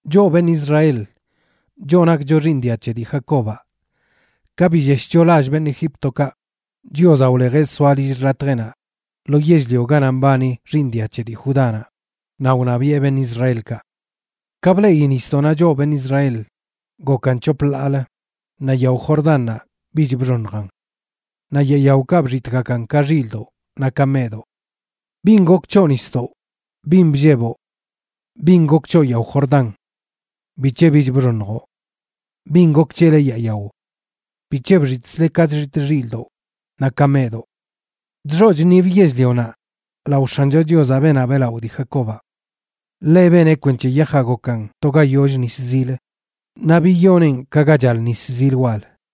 Choꞌ beṉꞌ Israel, choꞌ nakcho xiiṉ dia c̱he dii Jacobaꞌ, ka billeshcho lall beṉꞌ Egíptokaꞌ, Chiozaꞌ wlejeꞌ soa lill xḻatjeꞌnaꞌ lo yell-lio ganaꞌ mbani xiiṉ dia c̱he dii Judánaꞌ, naꞌ wṉabiꞌe beṉꞌ Israelkaꞌ. Ka bleꞌi nisdoꞌnaꞌ choꞌ beṉꞌ Israel gokan c̱hop ḻaalə, naꞌ yao Jordannaꞌ bich bxoṉjan. Naꞌ yaa yaokaꞌ bxitꞌgakan ka xildoꞌ naꞌ ka meꞌdoꞌ. ¿Bin gok c̱hoꞌ, nisdoꞌ? ¿Bin blleboꞌ? ¿Bin gok c̱hoꞌ, yao Jordán? ¿Bic̱he bich bxoṉjoꞌ? ¿Bin gok c̱hele, yaa yao? ¿Bic̱he bxitꞌzle ka chxitꞌ xilꞌdoꞌ naꞌ ka meꞌdoꞌ? Chxoꞌ chṉib yell-lionaꞌ, lao X̱ancho Chiozaꞌ, beenaꞌ beꞌlaꞌo dii Jacobaꞌ. Ḻeꞌ beneꞌ kwenc̱he yajaꞌ gokan to ga yoll nis zil, naꞌ biyoneꞌn ka ga chal nis zil wal.